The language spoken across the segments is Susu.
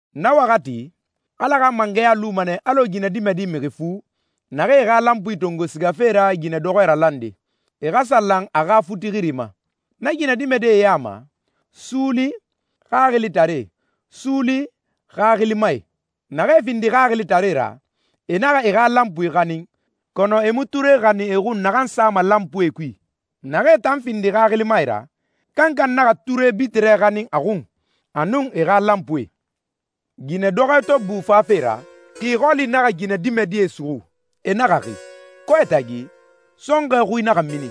«Na waxati, Ala xa mangɛya luma nɛ alɔ ginɛdimɛdi mixi fu, naxee e xa lanpuie tongo sigafe ra ginɛdɔxɔɛ ralande, e xa sa lan a xa futi xiri ma. Na ginɛdimɛdie ya ma, suuli, xaxilitaree, suuli, xaxilimae. Naxee findi xaxilitaree ra, e naxa e xa lanpuie xanin, kɔnɔ e mu ture xanin e xun naxan sama lanpuie kui. Naxee tan findi xaxilimae ra, kankan naxa ture bitirɛ xanin a xun, a nun e xa lanpuie.» «Ginɛdɔxɔɛ to bu fafe ra, xi xɔli naxa ginɛdimɛdie suxu, e naxa xi. Kɔɛ tagi, sɔnxɔɛ xui naxa mini,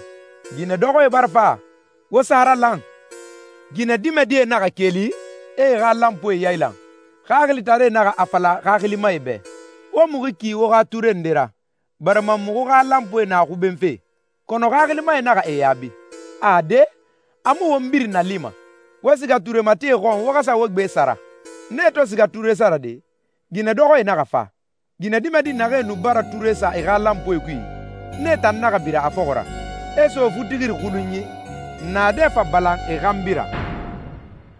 ‹Ginɛdɔxɔɛ bara fa! Wo sa a ralan!› Ginɛdimɛdie naxa keli, e e xa lanpuie yailan. Xaxilitaree naxa a fala xaxilimae bɛ, ‹Wo muxu ki wo xa ture nde ra, barima muxu xa lanpuie na xubenfe.› Kɔnɔ xaxilimae naxa e yaabi, ‹Ade, a mu won birin nalima. Wo siga ture matie xɔn wo xa sa wo gbe sara.› Nee to siga ture sarade, ginɛdɔxɔɛ naxa fa. Ginɛdimɛdi naxee nu bara ture sa e xa lanpuie kui, nee tan naxa bira a fɔxɔ ra, e so futixiri xulunyi, naadɛ fa balan e xanbi ra.»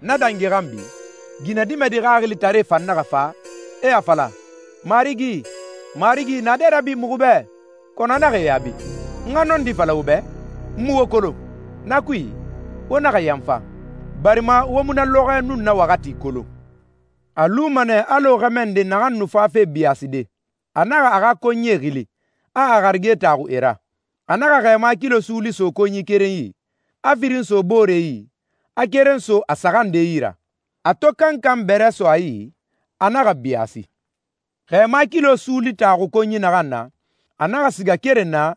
«Na dangi xanbi, ginɛdimɛdi xaxilitaree fan naxa fa, e a fala, ‹Marigi, marigi, naadɛ rabi muxu bɛ.› Kɔnɔ a naxa e yaabi, ‹N xa nɔndi fala wo bɛ, n mu wo kolon.›» «Na kui, wo naxa yanfa, barima wo mu na lɔxɔɛ nun na waxati kolon.» «A luma nɛ alɔ xɛmɛ nde naxan nu fafe biyaaside. A naxa a xa konyie xili, a a harige taxu e ra. A naxa xɛɛma kilo suuli so konyi keren yi, a firin so boore yi, a keren so a saxan nde yi ra. A to kankan bɛrɛ so a yi, a naxa biyaasi.» «Xɛɛma kilo suuli taxu konyi naxan na, a naxa siga keren na,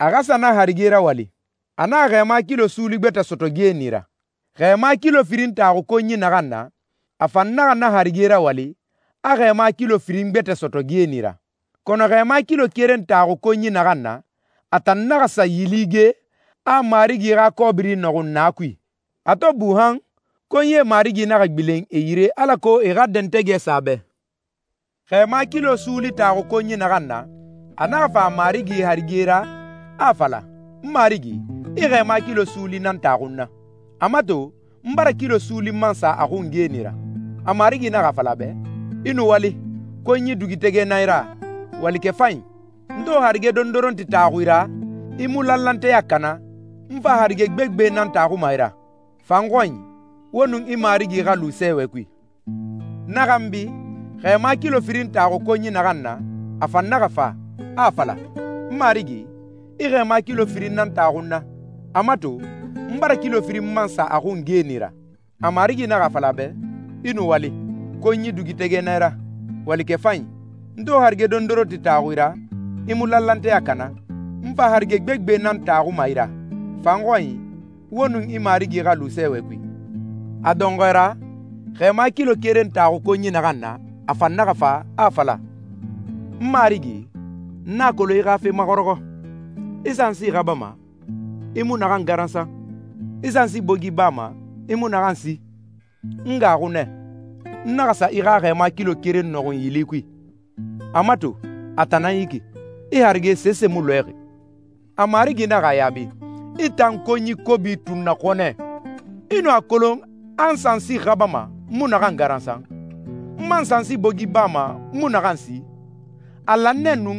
a xa sa na harige rawali. A naxa xɛɛma kilo suuli gbɛtɛ sɔtɔ geeni ra. Xɛɛma kilo firin taxu konyi naxan na, a fan naxa na harige rawali, a xɛɛma kilo firin gbɛtɛ sɔtɔ geeni ra. Kɔnɔ xɛɛma kilo keren taxu konyi naxan na, a tan naxa sa yili ge, a a marigi xa kɔbiri nɔxun na kui.» «A to bu han, konyie marigi naxa gbilen e yire alako e xa dɛntɛgɛ sa a bɛ. Xɛɛma kilo suuli taxu konyi naxan na, a naxa fa a marigi harige ra, a a fala, ‹N marigi, i xɛɛma kilo suuli nan taxu n na. A mato, n bara kilo suuli man sa a xun geeni ra.› A marigi naxa a fala a bɛ, ‹I nuwali. Konyi dugutɛgɛ nan i ra, walikɛ fanyi. N to harige dondoronti taxu i ra, i mu lanlanteya kana, n fa harige gbegbe nan taxuma i ra. Fa n xɔnyi, wo nun i marigi xa lu sɛɛwɛ kui.›» «Na xanbi, xɛɛma kilo firin taxu konyi naxan na, a fan naxa fa, a a fala, ‹N marigi, i xɛɛma kilo firin nan taxu n na. A mato, n bara kilo firin man sa a xun geeni ra.› A marigi naxa a fala a bɛ, ‹I nuwali. Konyi dugutɛgɛ nan i ra, walikɛ fanyi. N to harige dondoronti taxu i ra, i mu lanlanteya kana, n fa harige gbegbe nan taxuma i ra. Fa n xɔnyi, wo nun i marigi xa lu sɛɛwɛ kui.›» «A dɔnxɔɛ ra, xɛɛma kilo keren taxu konyi naxan na, a fan naxa fa, a a fala, ‹N marigi, n a kolon i xa fe maxɔrɔxɔ. I sansi xabama, i mu naxan garansan. I sansi bogi bama, i mu naxan si. N gaaxu nɛ. N naxa sa i xa xɛɛma kilo keren nɔxun yili kui. A mato, a tan nan yi ki. I harige sese mu lɔɛxi.› A marigi naxa a yaabi, ‹I tan konyi kobi tunnaxɔnɛ! I nu a kolon a n sansi xabama, n mu naxan garansan, n man sansi bogi bama, n mu naxan si? A lan nɛ nu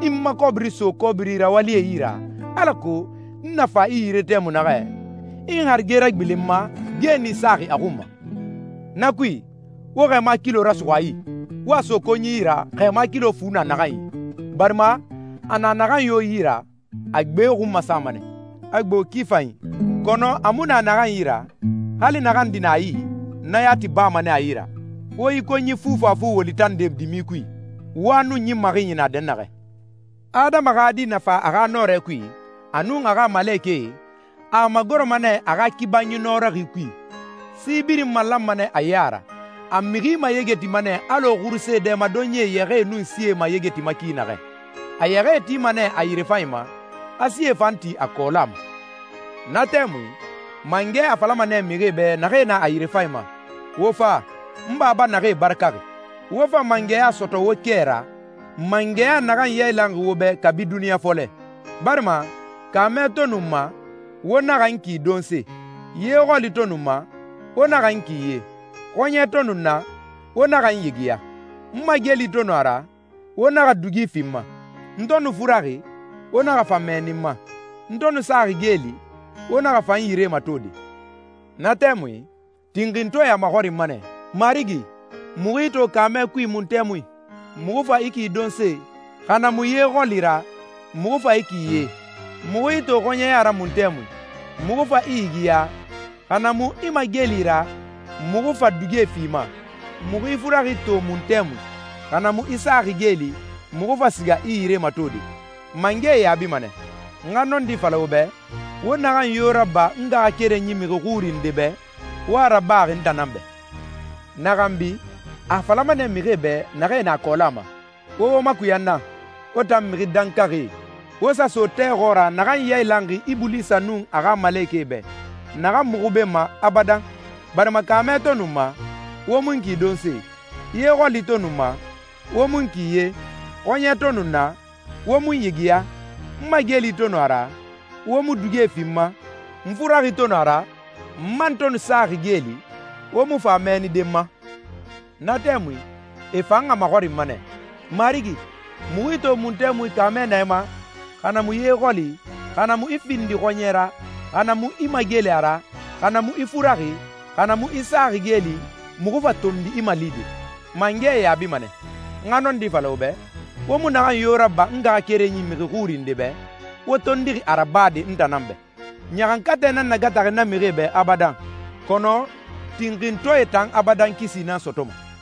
i n ma kɔbiri so kɔbiri rawalie yi ra, alako n na fa i yire tɛmui naxɛ, i n harige ragbilen n ma, geeni saxi a xun ma. Na kui, wo xɛɛma kilo rasuxu a yi, wo a so konyi yi ra, xɛɛma kilo fu na naxan yi, barima a na naxan yo yi ra, a gbe xun masama nɛ, a gbo ki fanyi. Kɔnɔ a mu na naxan yi ra, hali naxan di na a yi, na yati bama nɛ a yi ra. Wo yi konyi fufafu woli tande dimi kui, wa nun ɲin maxinyi na dɛnnaxɛ.›» «Adama xa Di na fa a xa nɔrɛ kui, a nun a xa malekɛe, a a magoroma nɛ a xa kibanyi nɔrɔxi kui. Si birin malanma nɛ a ya ra. A mixi mayegetima nɛ alɔ xuruse dɛmadonyi yɛxɛɛe nun sie mayegetima ki naxɛ. A yɛxɛɛe tima nɛ a yirefanyi ma, a sie fan ti a kɔɔla ma.» «Na tɛmui, mangɛ a falama nɛ mixie bɛ naxee na a yirefanyi ma, ‹Wo fa, n Baba naxee barakaxi. Wo fa mangɛya sɔtɔ wo kɛ ra, mangɛya naxan yailanxi wo bɛ kabi duniɲa fɔlɛ. Barima kaamɛ to nu n ma, wo naxa n ki donse. Ye xɔli to nu n ma, wo naxa n ki ye. Xɔɲɛ to nu n na, wo naxa n yigiya. N mageli to nu a ra, wo naxa dugie fi n ma. N to nu furaxi, wo naxa fa mɛɛni n ma. N to nu saxi geeli, wo naxa fa n yire matode.›» «Na tɛmui, tinxintɔɛe a maxɔrinma nɛ, ‹Marigi, muxu i to kaamɛ kui mun tɛmui, muxu fa i ki donse, xa na mu ye xɔli ra, muxu fa i ki ye? Muxu i to xɔɲɛya ra mun tɛmui, muxu fa i yigiya, xa na mu i mageli ra, muxu fa dugie fi i ma? Muxu i furaxi to mun tɛmui, xa na mu i saxi geeli, muxu fa siga i yire matode?› Mangɛ e yaabima nɛ, ‹N xa nɔndi fala wo bɛ, wo naxan yo raba n ngaxakerenyi mixi xuri nde bɛ, wo a rabaxi n tan nan bɛ.›» «Na xanbi, a a falama nɛ mixie bɛ naxee na a kɔɔla ma, ‹Wo wo makuya n na, wo tan mixi dankaxie, wo sa so tɛ xɔɔra naxan yailanxi Ibulisa nun a xa malekɛe bɛ, naxan mu xubenma abadan. Barima kaamɛ to nu n ma, wo mu n ki donse. Ye xɔli to nu n ma, wo mu n ki ye. Xɔɲɛ to nu n na, wo mu n yigiya. N mageli to nu a ra, wo mu dugie fi n ma. N furaxi to nu a ra, n man to nu saxi geeli, wo mu fa mɛɛnide n ma.›» «Na tɛmui, e fan a maxɔrinma nɛ, ‹Marigi, muxu i to mun tɛmui kaamɛ na i ma, xa na mu ye xɔli, xa na mu i findixi xɔɲɛ ra, xa na mu i mageli ra, xa na mu i furaxi, xa na mu i saxi geeli, muxu fa tondi i malide?› Mangɛ e yaabima nɛ, ‹N xa nɔndi fala wo bɛ, wo mu naxan yo raba n ngaxakerenyi mixi xuri nde bɛ, wo tondixi a rabade n tan nan bɛ.› Ɲaxankatɛ nan nagataxi na mixie bɛ abadan, kɔnɔ tinxintɔɛe tan abadan kisi nan sɔtɔma.»